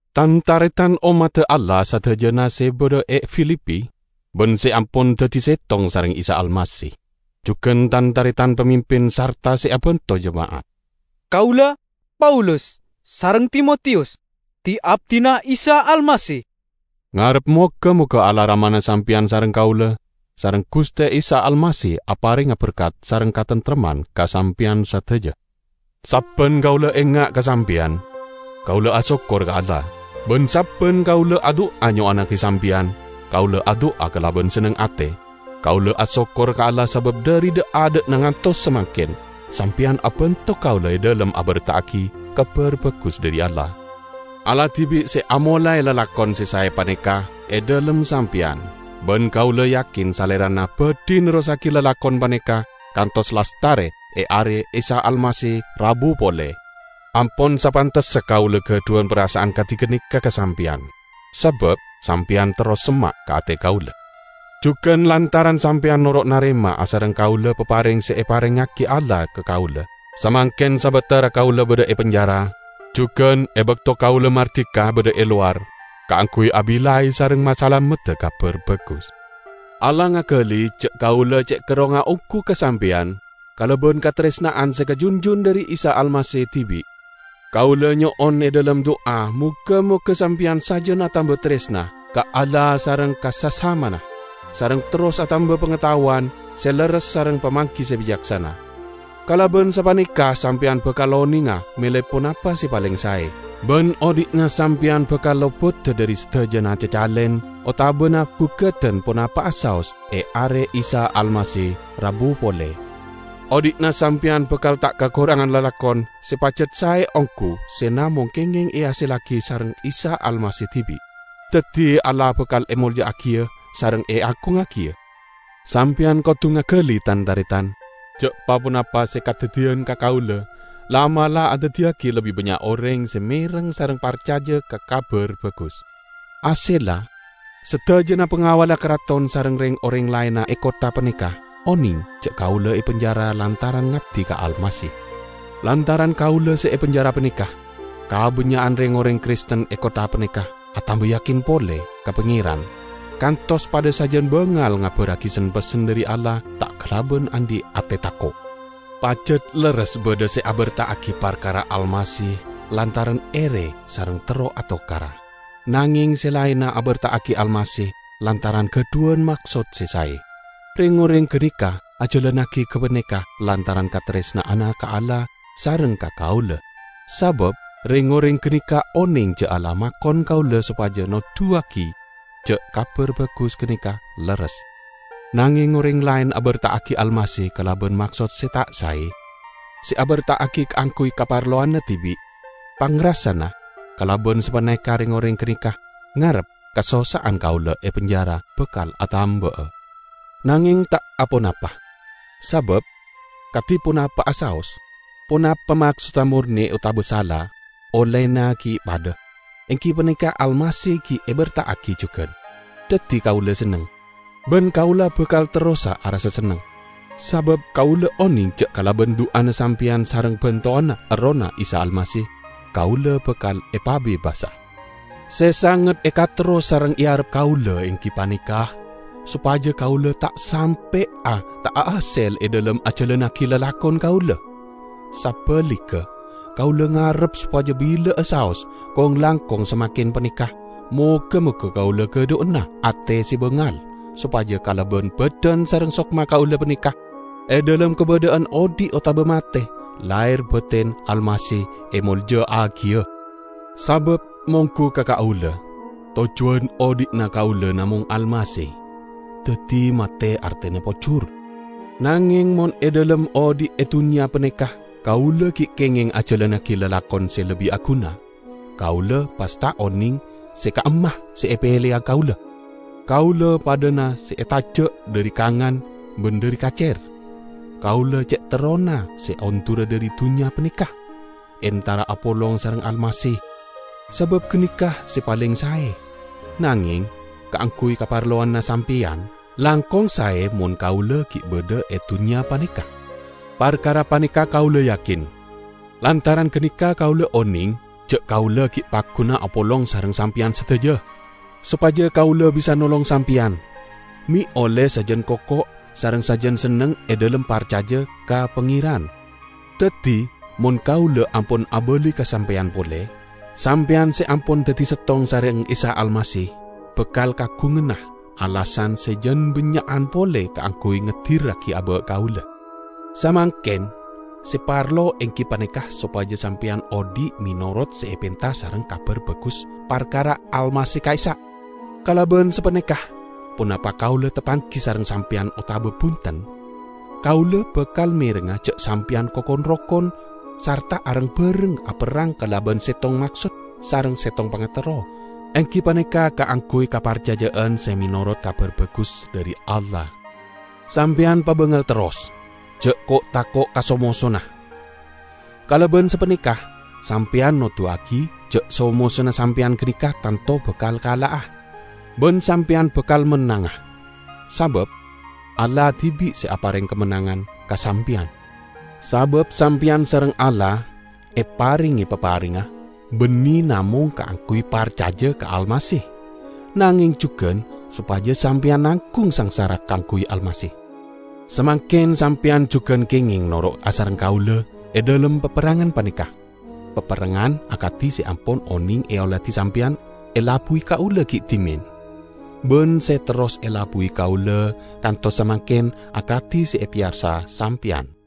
Tan-taretan ommadda Allah sadajana se badha e Filipi, ban se ampon daddi settong sareng Isa Almasih. Jugan tan-taretan pamimpin sarta se abanto jema'at! Kaula, Paulus, sareng Timotiyus, di-abdina Isa Almasih, ngarep moga-moga Allah Ramana sampeyan sareng kaula, sareng Guste Isa Almasih aparenga berkat sareng kataremtemman ka sampeyan sadaja. Sabban kaula enga' ka sampeyan, kaula asokkor ka Allah. Ban sabban kaula adu'a nyo'onnagi sampeyan, kaula adu'a kalaban senneng ate. Kaula asokkor ka Allah sabab dhari dha'-adha'na kantos samangken, sampeyan abanto kaula e dhalem aberta'agi Kabar Bagus dhari Allah. Allah dibi' se amolae lalakon se sae paneka e dhalem sampeyan, ban kaula yakin Salerana badhi nerrossagi lalakon paneka kantos lastare e Are Isa Almasih rabu pole. Ampon sapantessa kaula gadhuwan parasa'an kadi ganeka ka sampeyan, sabab sampeyan terros semma' ka ate kaula. Jugan lantaran sampeyan noro' narema asareng kaula papareng se eparengngagi Allah ka kaula; samangken sabatara kaula badha e penjara, jugan e bakto kaula mardika badha e lowar kaangguy abillai sareng masalamedda Kabar Bagus. Allah ngagali ja' kaula ce' kerrongnga onggu ka sampeyan kalaban kataresna'an se kajunjun dhari Isa Almasih dibi'. Kaula nyo'on e dhalem du'a moga-moga sampeyan sajan atamba taresna ka Allah sareng ka sasamana, sareng terros atamba pangataowan se lerres sareng pamanggi se bicaksana. Kalaban sapaneka sampeyan bakal onenga mele ponapa se paleng sae, ban odhi'na sampeyan bakal lopoda dhari sadajana cacalen otabana gugadan ponapa'a saos e Are Almasih rabu pole. Odhi'na sampeyan bakal ta' kakorangana lalakon se pajat sae onggu se namong kengeng ehasellagi sareng Isa Almasih dibi'; daddi Allah bakal emolja'agiya sareng eagungngagiya. Sampeyan kodu ngagali, tan-taretan, ja' pa-ponapa se kadaddiyan ka kaula la'-mala' andaddiyagi lebbi bannya' oreng se mereng sareng parcaja ka Kabar Bagus. Hasella, sadajana pangawalla karaton sareng reng-oreng laenna e kottha paneka oneng ja' kaula e penjara lantaran ngabdi ka Almasih. Lantaran kaula se e penjara paneka, kabannya'an reng-oreng Kristen e kottha paneka atamba yakin pole ka Pangeran, kantos padha sajan bangal ngabarragi sen-pessen dhari Allah ta' kalaban andhi' ate tako'. Pajat lerres badha se aberta'agi parkara Almasih lantaran ere sareng terro atokara, nangeng se laenna aberta'agi Almasih lantaran gadhuwan maksod se sae. Reng-oreng ganeka ajalannagi gapaneka lantaran kataresna'anna ka Allah sareng ka kaula, sabab reng-oreng ganeka oneng ja' Allah makon kaula sopaja noduwagi ja' Kabar Bagus ganeka lerres. Nangeng oreng laen aberta'agi Almasih kalaban maksod se ta' sae; se aberta'agi kaangguy kaparlowanna dibi'. Pangrasana, kalaban sapaneka reng-oreng ganeka ngarep kasossa'an kaula e penjara bakal atamba'a. Nangeng ta' aponapa! Sabab, kadi ponapa'a saos, ponapa maksodda morne otaba sala, ollena gi' padha, enggi paneka Almasih gi' eberta'agi jugan; daddi kaula senneng. Ban kaula bakal terrosa arassa senneng, sabab kaula oneng ja' kalaban du'ana sampeyan sareng bantowanna Errohna Isa Almasih, kaula bakal epabebasa. Se sanget ekaterro sareng earep kaula enggi paneka sopaja kaula ta' sampe'a ta' ahasel e dhalem ajalannagi lalakon kaula. Sabaligga, kaula ngarep sopaja bila'a saos, kong-langkong samangken paneka, moga-moga kaula gadhuwana ate se bangal, sopaja kalaban badan sareng sokma kaula paneka -- e dhalem kabadha'an odhi' otaba mate -- laher baten Almasih emolja'agiya. Sabab monggu ka kaula, tojjuwan odhi'na kaula namong Almasih! Daddi mate artena pojur. Nangeng mon e dhalem odhi' e dunnya paneka kaula gi' kengeng ajalannagi lalakon se lebbi aguna, kaula pas ta' oneng se ka'imma se epeleya kaula. Kaula padhana se etaja' dhari kangan ban dhari kacer. Kaula ce' terrona se ondura dhari dunnya paneka, entara apolong sareng Almasih, sabab ganeka se paleng sae; nangeng, kaangguy kaparlowanna sampeyan, langkong sae mon kaula gi' badha e dunnya paneka. Parkara paneka kaula yakin. Lantaran ganeka kaula oneng ja' kaula gi' pagguna apolong sareng sampeyan sadaja, sopaja kaula bisa nolong sampeyan, me' olle sajan koko sareng sajan senneng e dhalem parcaja ka Pangeran. Daddi, mon kaula ampon abali ka sampeyan pole, sampeyan se ampon daddi settong sareng Isa Almasih bakal kaagunganna alasan se jang bannya'an pole kaangguy ngedirragi aba' kaula. Samangken, se parlo enggi paneka sopaja sampeyan odhi' menorot se epenta sareng Kabar Bagus parkara Almasih ka'issa'. Kalaban sapaneka, ponapa kaula tapanggi sareng sampeyan otaba bunten, kaula bakal merengnga ja' sampeyan koko rokon sarta areng-bareng aperrang kalaban settong maksod sareng settong pangaterro, enggi paneka kaangguy kaparcaja'an se menorot Kabar Bagus dhari Allah. Sampeyan pabangal terros; ja' ko'-tako' ka so-mosona. Kalaban sapaneka sampeyan noduwagi ja' so-mosona sampeyan ganeka tanto bakal kala'a, ban sampeyan bakal mennanga, sabab Allah dibi' se apareng kamennangan ka sampeyan. Sabab sampeyan sareng Allah eparenge paparengnga banne namong kaangguy parcaja ka Almasih, nangeng jugan sopaja sampeyan nanggung sangsara kaangguy Almasih. Samangken sampeyan jugan kengeng noro' asareng kaula e dhalem paperrangan paneka, paperrangan akadi se ampon oneng eoladi sampeyan elabbuwi kaula gi' dhimen, ban se terros elabbuwi kaula kantos samangken akadi se epeyarsa sampeyan.